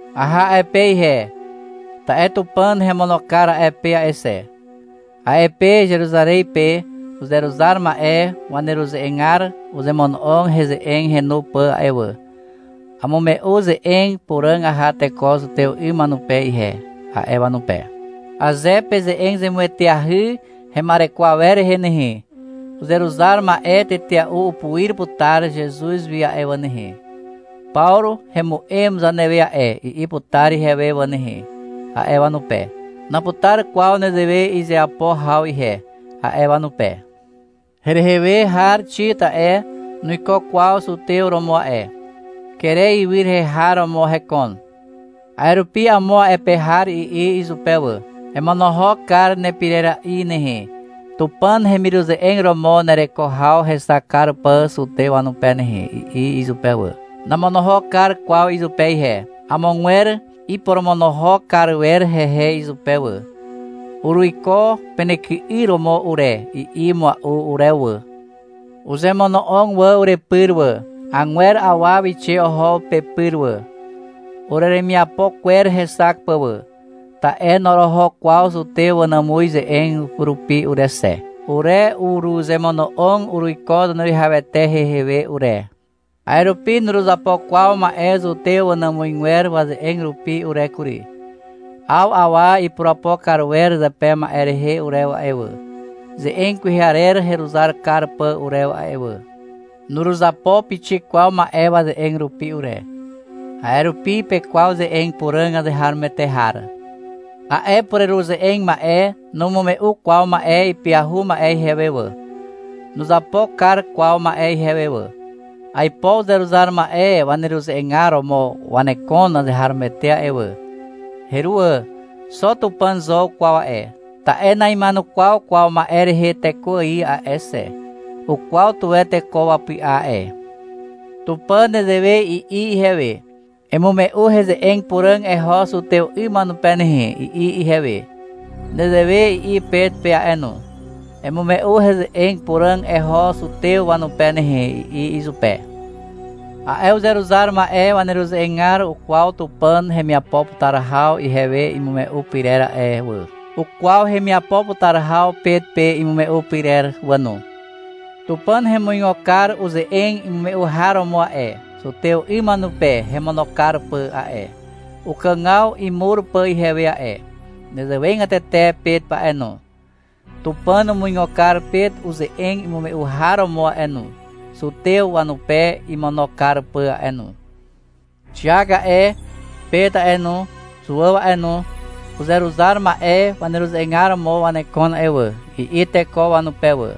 Aha a'e pe ihe, ta'e Tupàn hemono kar a'e pe a'e xe. A'e pe Zeruzarez pe uzeruzar ma'e waneruze'egar uzemono'og heze'eg henu pà a'e wà. — Amume'u ze'eg puràg aha teko zutew 'ym wanupe ihe, a'e wanupe. — Aze peze'eg zemueteahy hema'ereko awer rehe nehe, uzeruzar ma'e tetea'u upuir putar Zezuz wi a'e wà nehe. — Pawru hemu'em zanewe a'e, i'i putar ihewe wà nehe, a'e wanupe. — Naputar kwaw nezewe izeapo haw ihe, a'e wanupe. Herehe we har Xit a'e, nuiko kwaw zutew romo a'e. Kere ywy rehe har romo hekon. A'e rupi amo a'e pe har i'i izupe wà. — Emonohok kar nepirera'i nehe, Tupàn hemiruze'eg romo nereko haw hexak kar pà zutew wanupe nehe, i'i izupe wà. Namonohok kar kwaw izupe ihe. Amogwer iporomonohok kar wer hehe izupe wà. — Uruiko penyky'yr romo ure, i'i mua'u urewe wà. Uzemono'og wà urepyr wà. Agwer awa wixe oho pepyr wà, ureremiapo kwer hexak pà wà. Ta'e noroho kwaw zutew wanàmuz ze'eg rupi ure xe. Ure uruzemono'og uruiko Zaneruwihawete hehe we ure. A'e rupi nuruzapo kwaw ma'e zutew wanàmuzgwer waze'eg rupi ure kury. 'Aw awa ipurapo kar wer zepe ma'e rehe urewe a'e wà, ze'eg kwehe arer heruzar kar pà urewe a'e wà. Nuruzapo pixik kwaw ma'e waze'eg rupi ure. A'e rupi pekwaw ze'eg puràg azeharomoete har. A'e pureruze'eg ma'e numume'u kwaw ma'e ipyahu ma'e ihewe wà. Nuzapo kar kwaw ma'e ihewe wà. (Aipo uzeruzar ma'e waneruze'egar romo wanekon azeharomoete a'e wà. Heruwà. Xo Tupàn zo ukwaw a'e, ta'e na'ima'enukwaw kwaw ma'e rehe teko ài a'e xe. Ukwaw tuwe teko wapy'a a'e.) Tupàn nezewe i'i ihewe. — Emume'u heze'eg puràg eho zutew 'ym wanupe nehe, i'i ihewe. Nezewe i'i Pet pe a'e no. — Emume'u heze'eg puràg eho zutew wanupe nehe, i'i izupe. A'e uzeruzar ma'e waneruze'egar ukwaw Tupàn hemiapo putar haw ihewe imume'u pyrer a'e wà. Ukwaw hemiapo putar haw Pet pe imume'u pyrer wà no. Tupàn hemuigo kar uze'eg imume'u har romo a'e, zutew 'ym wanupe hemono kar pà a'e, ukàgaw imur pà ihewe a'e. Nezewegatete Pet a'e no. Tupàn umuigo kar Pet uze'eg imume'u har romo a'e no, zutew wanupe imono kar pà a'e no. — Xiak a'e, Pet a'e no, Zuàw a'e no, uzeruzar ma'e waneruze'egar romo wanekon a'e wà, i'i teko wanupe wà.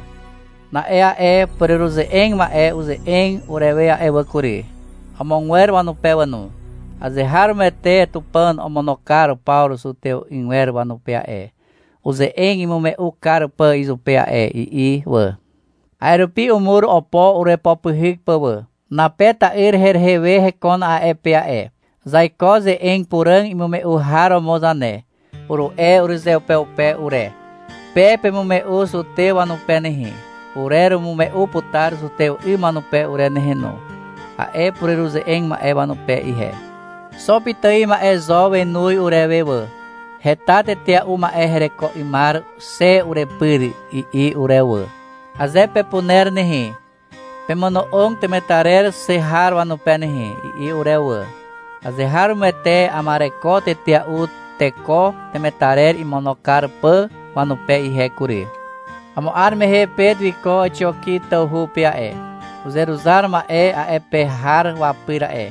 Na'e a'e pureruze'eg ma'e uze'eg urewe a'e wà kury, amogwer wanupe wà no. — Azeharomoete Tupàn omono kar Pawru zutew 'ygwer wanupe a'e, uze'eg imume'u kar pà izupe a'e, i'i wà. A'e rupi umur opo urepopyhyk pà wà. (Nape ta'yr herehe we hekon a'e pe a'e.) — Zaiko ze'eg puràg imume'u har romo zane, uru'e urezeupeupe ure. — Pe pemume'u zutew wanupe nehe, ure urumume'u putar zutew 'ym wanupe ure nehe no, a'e pureruze'eg ma'e wanupe ihe. Xo pitài ma'e zo wenoz urewe wà. — Heta tetea'u ma'e hereko 'ymar xe urepyr, i'i urewe wà. — Aze pepuner nehe, pemono'og temetarer xe har wanupe nehe, i'i urewe wà. Azeharomoete ama'ereko tetea'u teko temetarer imono kar pà wanupe ihe kury. Amo 'ar mehe Pet wiko Àxioki tawhu pe a'e, uzeruzar ma'e a'e pe har wapyr a'e.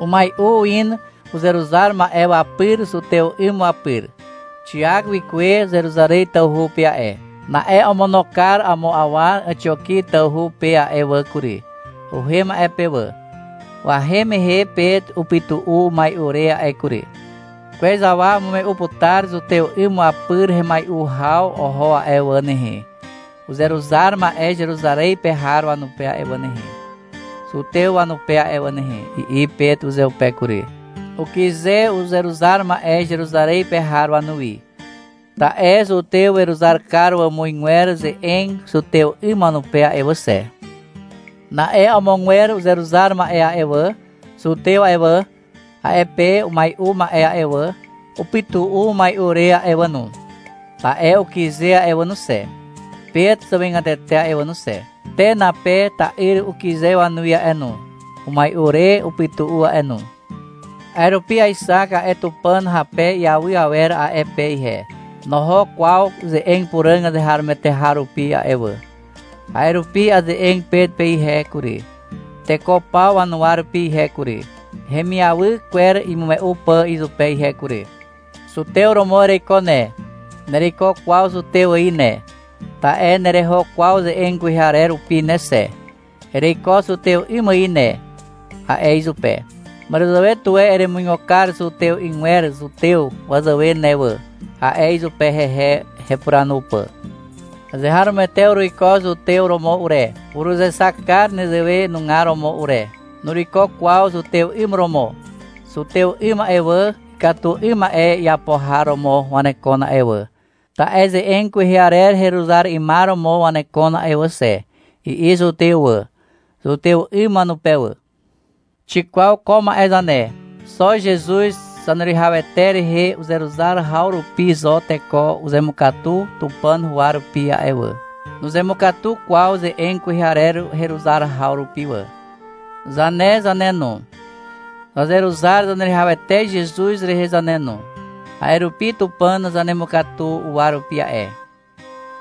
Umai'u in uzeruzar ma'e wapyr zutew 'ym wapyr. Xiak wikuwe Zeruzarez tawhu pe a'e. Na'e omono kar amo awa Àxioki tawhu pe a'e wà kury. Uhem a'e pe wà. Wahem mehe Pet upytu'u umai'u re a'e kury. — Kwez awa umume'u putar zutew 'ym wapyr hemai'u haw oho a'e wà nehe, uzeruzar ma'e Zeruzarez pe har wanupe a'e wà nehe, zutew wanupe a'e wà nehe, i'i Pet uzeupe kury. Ukyze uzeruzar ma'e Zeruzarez pe har wanuwi. Ta'e zutew weruzar kar wàmuzgwer ze'eg zutew 'ym wanupe a'e wà xe. Na'e amogwer uzeruzar ma'e a'e wà, zutew a'e wà, a'e pe umai'u ma'e a'e wà, upytu'u umai'u re a'e wà no. Ta'e ukyze a'e wà no xe, Pet zàwegatete a'e wà no xe. Te Nape ta'yr ukyze wanuwi a'e no, umai'u re upytu'u a'e no. A'e rupi aexak a'e Tupàn hape iawy awer a'e pe ihe. Noho kwaw ze'eg puràg azeharomoete har rupi a'e wà. A'e rupi aze'eg Pet pe ihe kury, teko paw wanuwa rupi ihe kury, hemiawy kwer imume'u pà izupe ihe kury. — Zutew romo ereiko ne. Nereiko kwaw zutew ài ne, ta'e nereho kwaw ze'eg kwehe arer rupi ne xe. Ereiko zutew 'ym ài ne, a'e izupe. — Màràzàwe tuwe eremuigo kar zutew 'ygwer zutew wazàwe ne wà, a'e izupe, hehe hepuranu pà. Azeharomoete uruiko zutew romo ure. Uruzexak kar nezewe nugar romo ure. Nuruiko kwaw zutew 'ym romo. — Zutew 'ym a'e wà, ikatu 'ym ma'e iapo har romo wanekon a'e wà, ta'e ze'eg kwehe arer heruzar 'ymar romo wanekon a'e wà xe, i'i zutew wà, zutew 'ym wanupe wà. Xikwaw ko ma'e zane. Xo Zezuz Zaneruwihawete rehe uzeruzar haw rupi zo teko uzemukatu Tupàn huwa rupi a'e wà. Nuzemukatu kwaw ze'eg kwehe arer heruzar haw rupi wà. Zane zane no, zazeruzar Zaneruwihawete Zezuz rehe zane no, a'e rupi Tupàn zanemukatu uwa rupi a'e.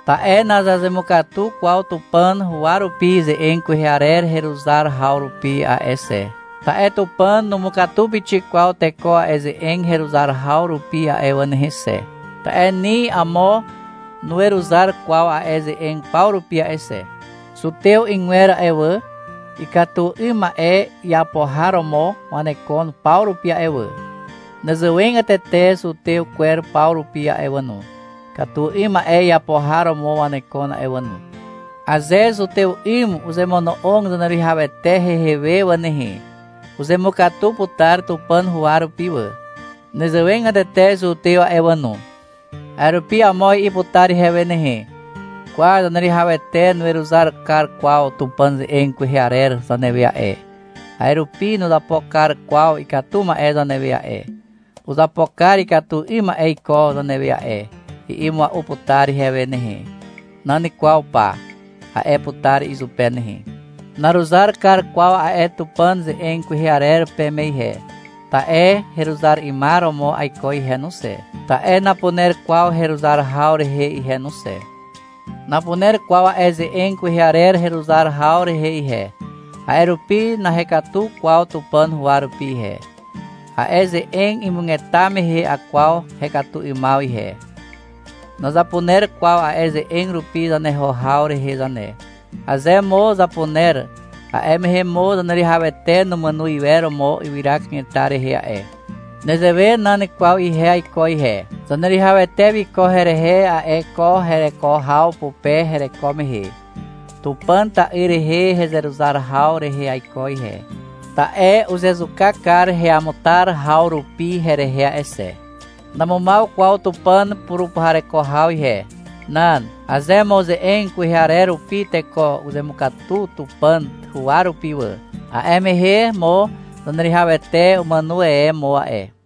Ta'e nazazemukatu kwaw Tupàn huwa rupi ze'eg kwehe arer heruzar haw rupi a'e xe. Ta'e Tupàn numukatu pixik kwaw teko a'e ze'eg heruzar haw rupi a'e wà nehe xe. Ta'e ni amo nuweruzar kwaw a'e ze'eg paw rupi a'e xe. Zutew 'ygwer a'e wà, ikatu 'ym ma'e iapo har romo wanekon paw rupi a'e wà. Nezewegatete zutew kwer paw rupi a'e wà no, ikatu 'ym ma'e iapo har romo wanekon a'e wà no. Aze zutew 'ym uzemono'og Zaneruwihawete hehe we wà nehe, uzemukatu putar Tupàn huwa rupi wà. Nezewegatete zutew a'e wà no. A'e rupi amo i'i putar ihewe nehe. — Kwa, Zaneruwihawete nuweruzar kar kwaw Tupàn ze'eg kwehe arer zanewe a'e, a'e rupi nuzapo kar kwaw ikatu ma'e zanewe a'e. Uzapo kar ikatu 'ym ma'e iko zanewe a'e, i'i mua'u putar ihewe nehe. — Nan kwaw pa, a'e putar izupe nehe. Naruzar kar kwaw a'e Tupàn ze'eg kwehe arer peme ihe, ta'e heruzar 'ymar romo aiko ihe no xe, ta'e napuner kwaw heruzar haw rehe ihe no xe. Napuner kwaw a'e ze'eg kwehe arer heruzar haw rehe ihe, a'e rupi nahekatu kwaw Tupàn huwa rupi ihe. A'e ze'eg imugeta mehe akwaw hekatu 'ymaw ihe. Nazapuner kwaw a'e ze'eg rupi zaneho haw rehe zane. Aze mo zapuner, a'e mehe mo Zaneruwihawete numàno iwer mo ywyra kanetar rehe a'e. Nezewe nan kwaw ihe aiko ihe. Zaneruwihawete wiko herehe a'e ko hereko haw pupe hereko mehe. Tupàn Ta'yr rehe hezeruzar haw rehe aiko ihe. Ta'e uzezuka kar heamutar haw rupi herehe a'e xe. Namumaw kwaw Tupàn purupuhareko haw ihe. Nan. Aze mo ze'eg kwehe arer rupi teko uzemukatu Tupàn huwa rupi wà, a'e mehe mo Zaneruwihawete umàno e mo a'e.